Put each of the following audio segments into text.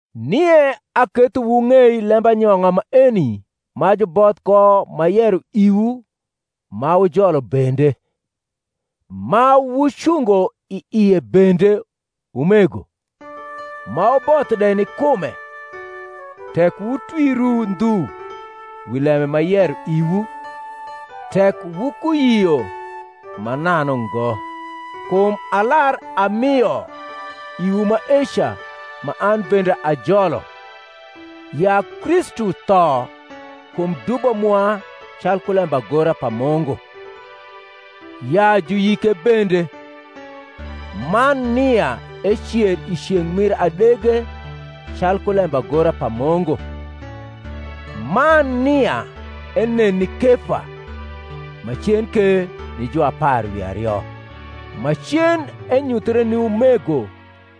Nie aketho wung’ei lembanyong’a maeni ma juboth ko m’ayero iwu ma wujolo bende, ma wucungo i ie bende, umego, ma wuboth de ni kume, tek wutwiru ndhu wi lembe m’ayero iwu, tek wukuyio mananu ngo. Kum alar amio iwu maeca ma an bende ajolo: ya Kristu tho kum dubo mwa calku lembagora pa Mungu: ya juyike bende; man nia ecer i ceng’ mir adege calku lembagora pa Mungu; man nia enen ni Kefa; macen ke ni juapar wi ario; macen enyuthre ni umego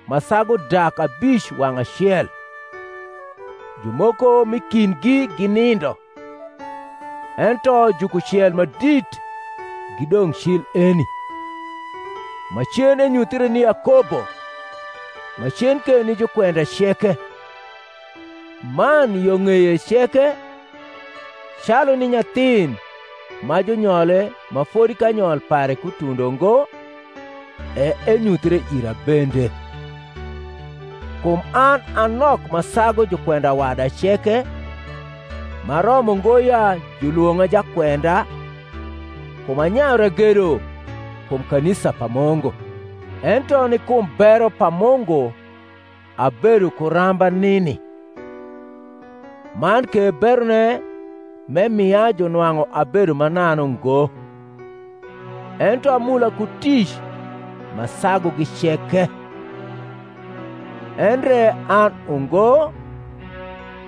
ma sagu dak abic wang’ acel, jumoko m’i kindgi ginindo, ento jukucel ma dit gidong’ cil eni; macen enyuthre ni Yakobo; macen ke ni jukwenda ceke; man yo ng’eye ceke, calu ni nyathin ma junyole ma fodi kanyol pare kutundo ngo, e enyuthre ira bende. Kum an a nok ma sagu jukwenda wada ceke, m’aromo ngo ya julwong’a jakwenda, kum anyayu ragedo kum kanisa pa Mungu. Ento ni kum bero pa Mungu abedo ku ramba nini: man ke berone m’emia junwang’u ebedo mananu ngo: ento amula ku tic ma sagugi ceke: endre an ungo,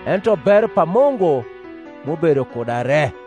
ento bero pa Mungu m’ubedo kuda re.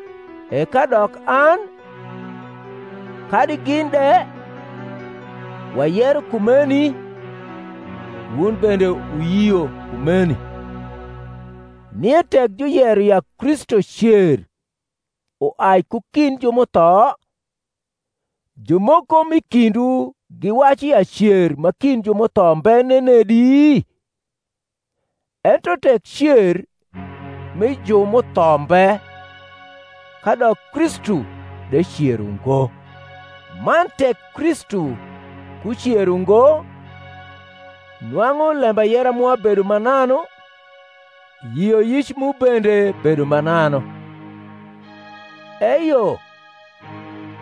E kadok an, kadi gin de, wayero kumeni, wun bende wuyio kumeni. Nie tek juyero ya Kristu cer uai ku kind ju m’utho, jumoko m’i kindwu giwacu ya cer ma kind ju m’utho mbe nenedi? Ento tek cer mi ju m’utho mbe, kadok Kristu de cer ungo: man tek Kristu kucer ungo, nwang’u lembayera mwa bedo mananu, yioyic mu bende bedo mananu. Eyo,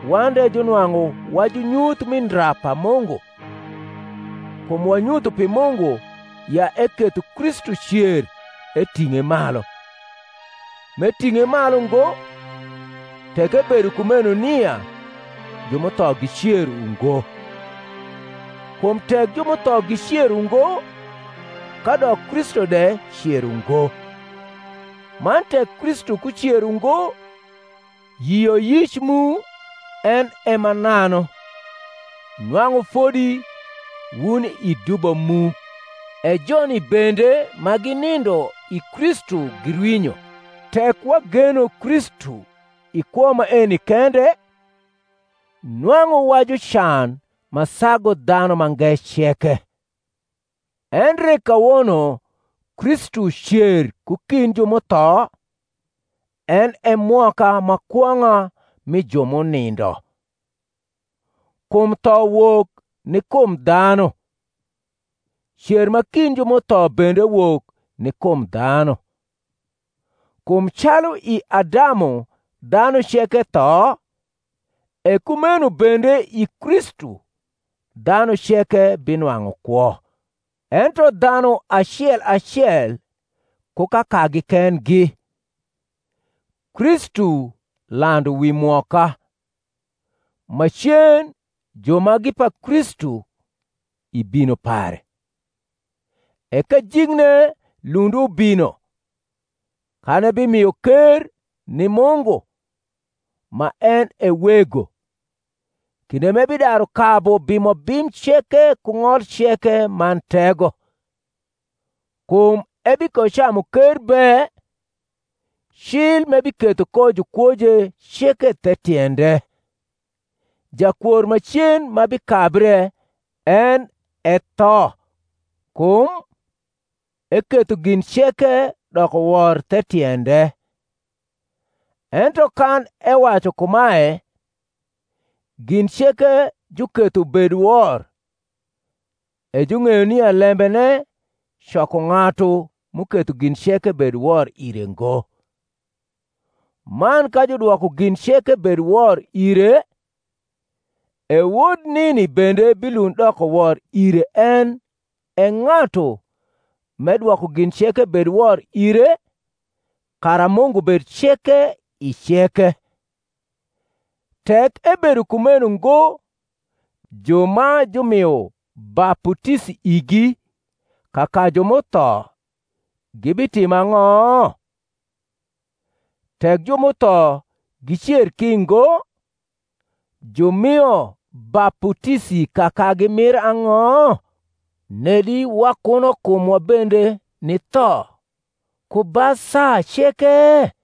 wan de junwang’u wa junyuth mi ndra pa Mungu; kum wanyutho pi Mungu ya eketho Kristu cer eting’e malu: m’eting’e malu ngo, tek ebedo kumeno nia ju m’utho gicer ungo. Kum tek ju m’utho gicer ungo, kadok Kristu de cer ungo: man tek Kristu kucer ungo, yioyic mu en e mananu; nwang’u fodi wuni i dubo mu. E joni bende ma ginindo i Kristu girwinyo. Tek wageno Kristu i kwo maeni kende, nwang’u wa jucan ma sagu dhanu mange ceke. Endre kawono Kristu cer ku kind ju m’utho, en e mwoka ma kwong’a mi ju m’unindo. Kum tho wok ni kum dhanu, cer ma kind ju m’utho bende wok ni kum dhanu. Kum calu i Adamu dhanu ceke tho, e kumeno bende i Kristu dhanu ceke binwang’u kwo. Ento dhanu acel acel ku kakagi kendgi: Kristu landu wi mwoka; macen ju ma gi pa Kristu, i bino pare. E kajikne lund ubino, kan ebimio ker ni Mungu, ma en e Wego; kinde m’ebidaru kabu bimobim ceke ku ng’ol ceke man tego. Kum ebikocamu ker be, cil m’ebiketho ko jukwoje ceke the tiende. Jakwor macen ma bikabre en e tho. Kum, Eketho gin ceke doko wor the tiende. Ento kan ewacu kumae, Gin ceke juketho ubed wor, e jung’eyo nia lembene coko ng’atu m’uketho gin ceke bed wor ire ngo. Man ka judwoko gin ceke bed wor ire, e Wod nini bende bilund doko wor ire en e ng’atu m’edwoko gin ceke bed wor ire, kara Mungu bed ceke i ceke. Tek ebedo kumeno ngo ju ma jumio baputisi igi kaka ju m’utho gibitimo ang’o? Tek ju m’utho gicer ki ngo, jumio baputisi kakagi mir ang’o? nedi wakuno kumwa bende ni tho ku ba saa ceke?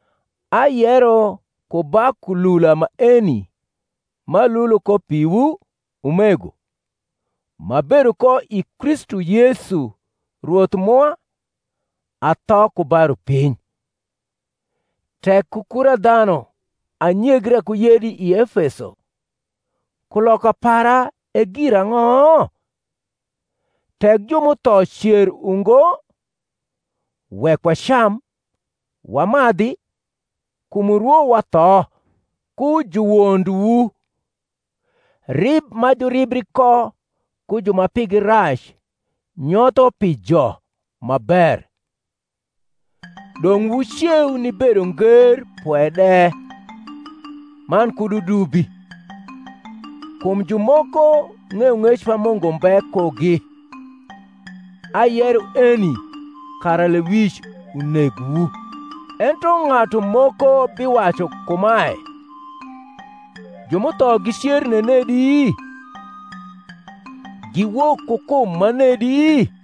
Ayero ku ba kulula maeni m’alulo ko piwu, umego, m’abedo ko i Kristu Yesu Rwoth mwa, atho ku ba rupiny. Tek ku kura dhanu anyegra ku yedi i Efeso, kuloka para e girang’o? Tek ju m’utho cer ungo, wek wacam wamadhi, kum urwo watho. Ku juwondwu: Rib ma juribri ko ku ju ma pigi rac nyotho pi jo ma ber. Dong’ wuceu ni bedonger pwe de, man kud wudubi; kum jumoko ng’eyong’ec pa Mungu mbe kugi: ayero eni kara lewic unegwu. Ento ng’atu moko biwacu kumae, Ju m’utho gicer nenedi? Giwok ku kum manedi?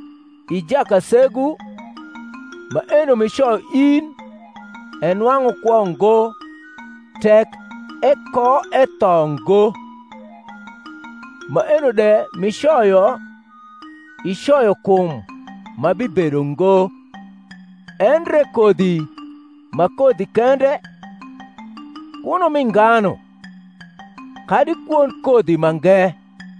I jakasegu, maeno m’icoyo in enwang’u kwo ngo tek ekoetho ngo: maeno de m’icoyo, icoyo kum ma bibedo ngo, endre kodhi ma kodhi kende, kuno mi nganu, kadi kwond kodhi mange;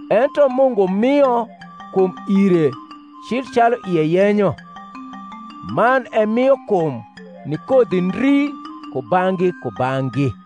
ento Mungu mio kum ire cil calu ie yenyo, man emio kum ni kodhi ndri kubang’gi kubang’gi.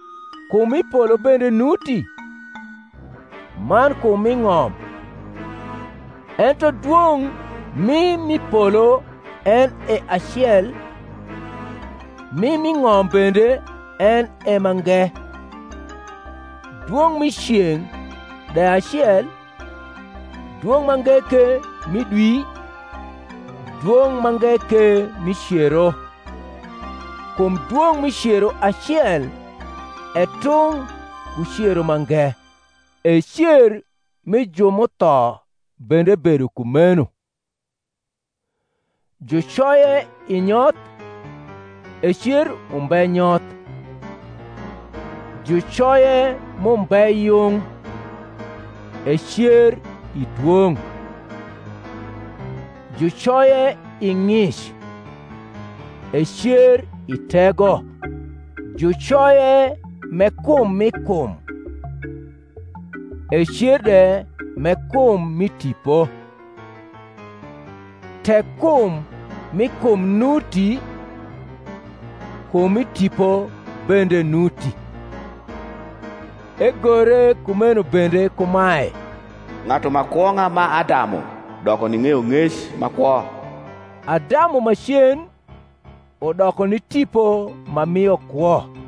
Kum m’i polo bende nuti, man kum m’i ng’om: ento dwong’ mi m’i polo en e acel, mi m’i ng’om bende en e mange. Dwong’ mi ceng’ de acel, dwong’ mange ke mi dwi, dwong’ mange ke mi cero; kum dwong’ mi cero acel e tung’ ku cero mange. E cer mi ju m’utho bende bedo kumeno. Jucoye i nyoth; ecer umbe nyoth: jucoye m’umbe yung; ecer i dwong’: jucoye i ng’ic; ecer i tego: jucoye m’e kum mi kum; ecer de m’e kum mi tipo. Tek kum mi kum nuti, kum mi tipo bende nuti. Egore kumeno bende kumae, Ng’atu ma kwong’a ma Adamu doko ni ng’eyong’ec ma kwo. Adamu macen udoko ni tipo ma mio kwo.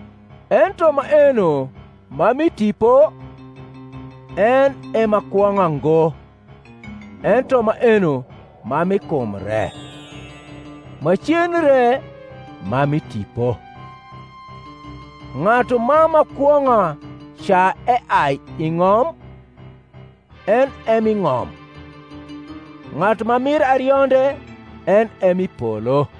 Ento maeno ma mi tipo, en e ma kwong’a ngo, ento maeno ma mi kum re; macen re ma mi tipo. Ng’atu ma ma kwong’a ca eai i ng’om, en e mi ng’om; ng’atu ma mir arionde en e mi polo.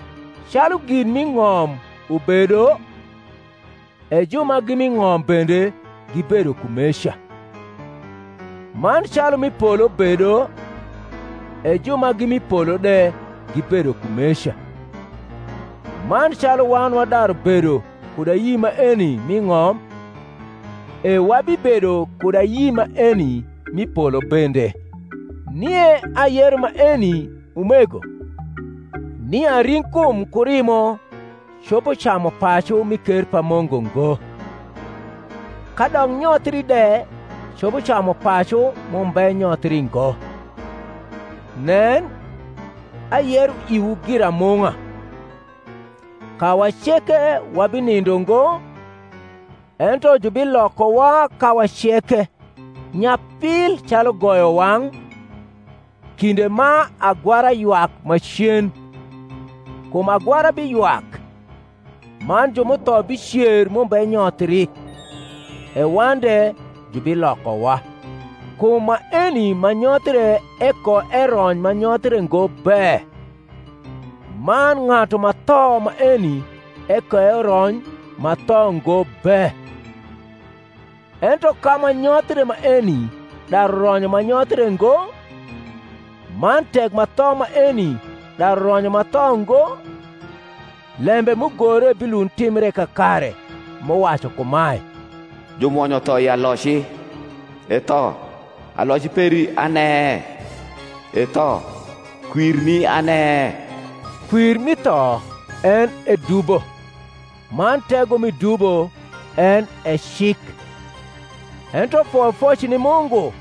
Calu gin m’i ng’om ubedo, e ju ma gi mi ng’om bende gibedo kumeca: man calu m’i polo bedo, e ju ma gi mi polo de gibedo kumeca. Man calu wan wadaru bedo kud ayi maeni mi ng’om, e wabibedo kud ayi maeni mi polo bende. Nie ayero maeni, umego, nia ring’kum ku rimo copo camu pacu mi ker pa Mungu ngo: kadok nyothri de copo camu pacu m’umbe nyothii ngo. Nen, ayero iwu giramung’a: Kawa ceke wabinindo ngo, ento jubilokowa kawa ceke, nyapil calu goyowang’, kinde ma agwara ywak macen: kum agwara biywak, man ju m’utho bicer m’umbe nyothri, e wan de jubilokowa. Kum maeni ma nyothre ekoerony ma nyothre ngo be, man ng’atu ma tho maeni ekoerony ma tho ngo be. Ento ka ma nyothre maeni daru ronyo ma nyothre ngo, man tek ma tho maeni daru ronyo ma tho ngo, lembe m’ugore bilund timbre kakare m’uwacu kumae, Jumwonyo tho i aloci. E tho, aloci peri ane? E tho, kwirni ane? Kwir mi tho en e dubo; man tego mi dubo en e cik: ento foyofoc ni Mungu,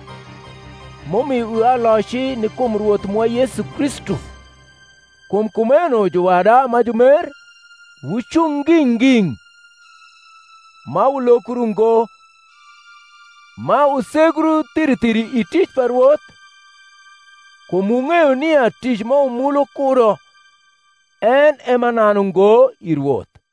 m’umio iwa aloci ni kum Rwoth mwa Yesu Kristu. Kum kumeno, juwada ma jumer, wucung nging’ nging’, ma wulokru ngo, ma wusegru thiri thiri i tic pa Rwoth, kum wung’eyo nia tic ma wumulu kudo en e mananu ngo i Rwoth.